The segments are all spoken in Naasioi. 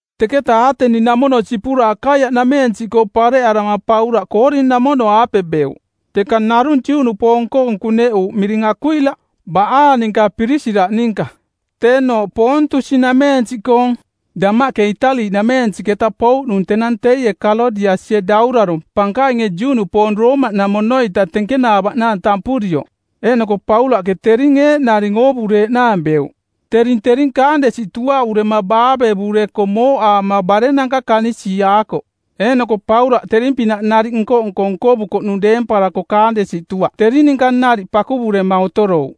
Teketa Aateni-namono sipura Akaiaꞌnameensiꞌkoo pareꞌarama Paulaꞌ Koorin-namono-aape beuꞌ. Teka narung Juꞌnupoong-koong kuneꞌuuꞌ miring Akuila, baꞌaang ninka Pirisila ninka, teenooꞌ Poontusi-nameensiꞌkoong, damaꞌke Itali-nameensiꞌketa pouꞌnung tenang teie Kalodiasie daurarong˜ pankainge Juꞌnupoong Roomaꞌnamono-ita tenkenaavaꞌnaang tampurioꞌ. Eeꞌnoko Paulaꞌke tering eeꞌnaring oovureeꞌnaang beuꞌ. Tering tering kaandesi tuaꞌurema baavevurekoꞌ mooꞌaama barenanka kanisiiaakoꞌ. Eeꞌnoko Paulaꞌ tering-pinaꞌ nariꞌ nko-nko nkovukoꞌnung deemparako kaandesi tuaꞌ tering ninka nariꞌ pakuvurema otorouꞌ.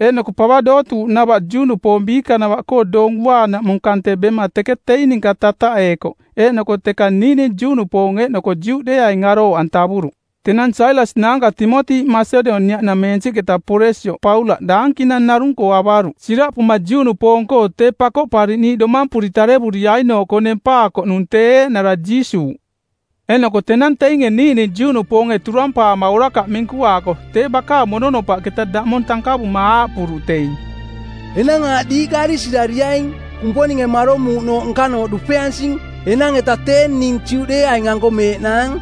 Eeꞌnoko pava dootuuꞌnava Juꞌnupoong biikanava-koo Doong Uaanaꞌmung kante bema teke teing ninka tataꞌeekoꞌ eeꞌnoko teka niiꞌning Juꞌnupoong eeꞌnoko Juꞌdeeaing arooꞌantavuruꞌ. Tenang Sailas naanka Timoti Masedoniaꞌnameensiꞌketa poresioꞌ Paulaꞌ daankinang narung-koo avaruꞌ siraꞌpuma Juꞌnupoong-koo tee Pakoꞌpariꞌniiꞌ domampuri tarevuriainooꞌkoo nempaakoꞌnung tee eeꞌnara Jiisuuꞌ. Eeꞌnoko tenang teinge niiꞌning Juꞌnupoonge turampaama orakaꞌ minkuaako tee bakaang mononopaꞌketa daꞌmong tankavuma aaꞌpuruꞌ teing, “Enang aaꞌ diiꞌka arisirariaing. Kumponinge maromuuꞌnooꞌ nkanooꞌ dupeansing. Enang-eta tee ning Juꞌdeeaing-anko meeꞌnaang.”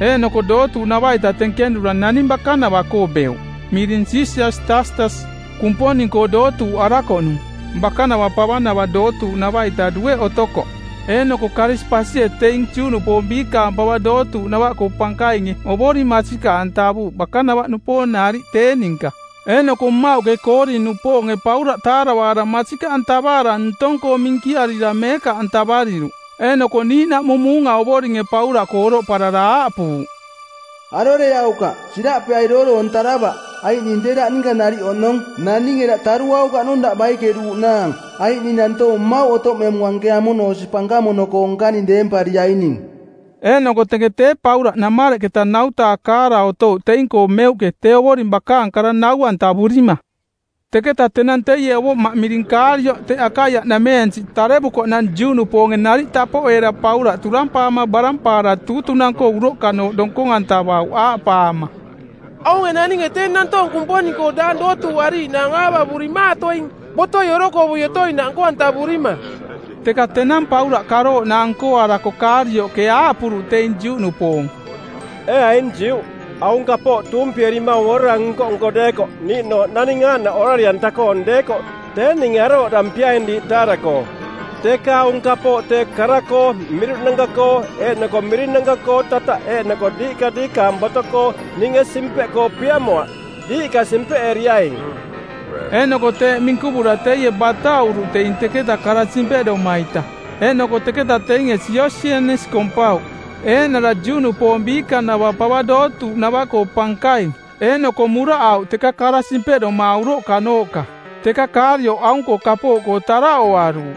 Eeꞌnoko dootuuꞌnava-ita tenkenura naning bakanava-koo beuꞌ miring Sisias Taastas, Kumponing-koo dootuuꞌarakoꞌnung. Bakanava pavanava dootuuꞌnava-ita dueꞌke otokoꞌ. Eeꞌnoko Karisipasie teing Juꞌnupoong biikanava pava dootuuꞌnava-koo pankainge Ovoring masikaꞌantavuuꞌ bakanava-nupoong nariꞌ tee ninka. Eeꞌnoko mmauꞌke Koorin-nupoonge Paulaꞌ taaravaara masikaꞌantavaara ntong-koo minkiarira meekaꞌantavariruꞌ. Eeꞌnoko niiꞌnaꞌmung muunga Ovoringe Paulaꞌkoo oroꞌparara aaꞌpuuꞌ, “Aroreaukaꞌ, siraꞌpeai dooroontaravaꞌ, aiꞌ ning tee daꞌ ninka nariꞌ oꞌnong. Naninge daꞌ taruaukaꞌnung daꞌ baikeruuꞌnaang, aiꞌ ning nantoong mmauꞌ otoꞌmemung anke amono osi pankamono-koo nkaning deempariaining.” Eeꞌnoko teke tee Paulaꞌ namareꞌketa nautaakaara otouꞌ teing-koo meuꞌke tee Ovoring bakaang kara nau-antavurima. Teketa tenang teie ovoꞌmaꞌ miring Kaalioꞌ teꞌ Akaiaꞌnameensiꞌ tarevukoꞌnang Juꞌnupoonge nariꞌ tapoꞌeera Paulaꞌ turampaama barampaara tuutunang-koo uroꞌkanooꞌ donkong-antavauꞌ aaꞌpaama, “Aunge naninge tee nantoong Kumponing-koo daang dootuuꞌariiꞌnaang aavavurimaatoing botoi orokovui otoinaꞌ nko-antavurima.” Teka tenang Paulaꞌ karooꞌnaang nkoarako Kaalioꞌke aaꞌpuruꞌ teing Juꞌnupoong, “Ee aing Juꞌ, aung kapooꞌ tuumpierimaung orara nko-nko deekoꞌ niiꞌnooꞌ naning aaꞌnaꞌ orari-anta-koong deekoꞌ tee ninge arooꞌdampiaing diiꞌ taara-koo. Teka aung kapooꞌ tee kara-koo miruꞌnanka-koo eeꞌnoko mirinanka-koo tataꞌ eeꞌnoko diiꞌka diikaang boto-koo, ninge simpeꞌkoo piamoaꞌ. Diiꞌka simpeꞌeriaing.” Eeꞌnoko teeꞌ minkuvura teie bataꞌuruꞌ teing teketa kara simpeꞌdoma-ita. Eeꞌnoko teketa teinge Siosienis kompauꞌ, eeꞌnara Juꞌnupoong biikanava pava dootuuꞌnava-koo pankaing, eeꞌnoko muraꞌauꞌ teka kara simpeꞌdoma uroꞌkanooꞌka. Teka Kaalioꞌ aung-koo kapooꞌkoo taraꞌoaruuꞌ.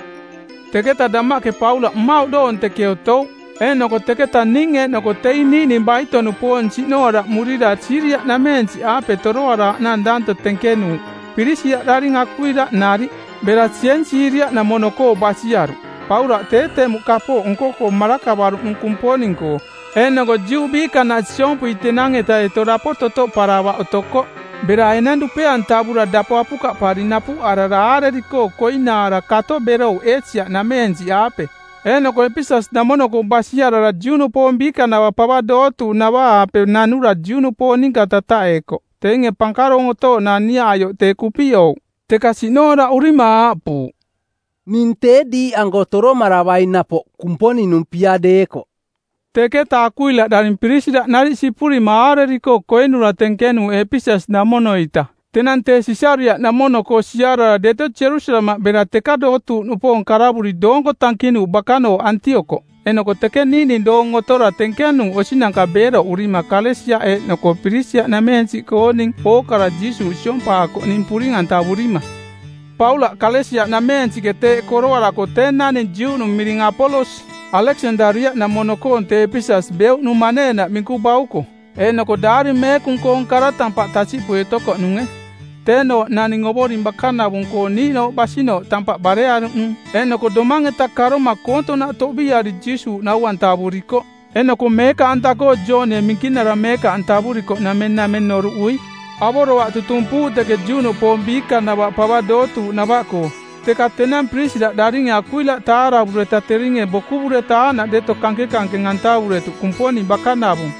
Teketa damaꞌke Paulaꞌ mmauꞌ doong teke otouꞌ, eeꞌnoko teketaꞌ ning eeꞌnoko teing niiꞌning baito-nupoong siꞌnooraꞌmurira Siiria-nameensiꞌaape toroaraaꞌnaang danto tenkenuuꞌ Pirisila daring Akuila nariꞌ. Bera Siensiria-namono-koo basiaruꞌ. Paulaꞌ tee temuꞌ kapooꞌ nko-koo marakavaruꞌnung Kumponing-koo, eeꞌnoko Juꞌ biikanaꞌ siompui tenang-eta deto dapo totoꞌparavaꞌ otokoꞌ. Bera enang dupe-antavura dapo apukaꞌpari napuꞌarara aareri-koo koinaara kato berouꞌ Eesia-nameensiꞌaape. Eeꞌnoko Epeses-namono-koo basiarara Juꞌnupoong biikanava pava dootuuꞌnava-aape nanura Juꞌnupoong ninka tataꞌeekoꞌ. Teinge pankaroong otooꞌnaang niaꞌaioꞌ tee kupiꞌouꞌ. Teka siꞌnooraꞌurima aaꞌpuuꞌ, “Ning tee diiꞌanko toromaravaing napoꞌ, Kumponing-nung pia deekoꞌ.” Teketa Akuila daring Pirisila nariꞌ sipurima aareri-koo koinura tenkenuuꞌ Epeses-namono-ita. Tenang tee Sisariaꞌnamono-koo siarara deto Jerusalemaꞌ bera teka dootuuꞌnupoong karavuri doonko tankinuuꞌ bakanooꞌ Antiokoꞌ. Eeꞌnoko teke niiꞌning doong otora tenkenuuꞌ osinanka beeroꞌurima Kalesia eeꞌnoko Pirisiaꞌnameensiꞌkooning ookara Jiisuuꞌ siompaakoꞌning puring-antavurima. Paulaꞌ Kalesia-nameensiꞌke teeꞌ koroarako tee naning Juꞌnung miring Apolos, Aleksandaria-namono-koong tee Epeses beuꞌnung maneenaꞌ minku bauko, eeꞌnoko Daari Meekung-koong kara tampaꞌ tasiꞌpui otokoꞌnunge. Teenooꞌ tee naning Ovoring bakanavung-koo niiꞌnooꞌ basinooꞌ tampaꞌ barearuꞌnung, eeꞌnoko domang-eta karoma koontoꞌnaꞌ toꞌbiiari Jiisuuꞌ nau-antavurikoꞌ eeꞌnoko meekaꞌanta-koo Joonie Minkinara meekaꞌantavurikoꞌnameng nameng noruꞌui. Avoroaꞌ kara tutumpuuꞌ teke Juꞌnupoong biikanava pava dootuuꞌnava-koo, teka tenang Pirisila daringe Akuila taaravureta teringe bokuvureta aaꞌnaꞌ deto kankenkankeng-antavuretuꞌ Kumponing bakanavung.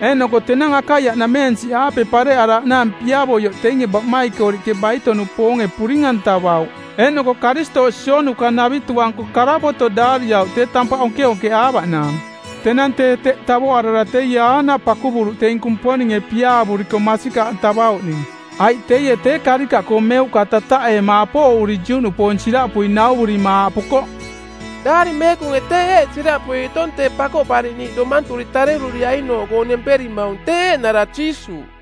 Eeꞌnoko tenang Akaiaꞌnameensiꞌaape pareꞌaraaꞌnaang piavoioꞌ teinge baꞌmaikoriꞌke baito-nupoonge puring-antavauꞌ eeꞌnoko Karistooꞌ sionuka-navitu-anko karavoto˜ daariauꞌ tee tampaꞌ onkeonkeꞌaavaꞌnaang. Tenang tee teꞌ tavoꞌarara teie aaꞌnaꞌ pakuvuruꞌ teing Kumponinge piaavuriko masikaꞌantavauꞌning. Aiꞌ teie tee karikaꞌkoo meuꞌka tataꞌeema apooꞌuri Juꞌnupoong siraꞌpui nauvurima aaꞌpukoꞌ, “Daari Meekunge tee eeꞌ siraꞌpui otong tee Pakoꞌpariꞌniiꞌ domanturi tareruriainooꞌkoo nemperimaung tee eeꞌnara Jiisuuꞌ.”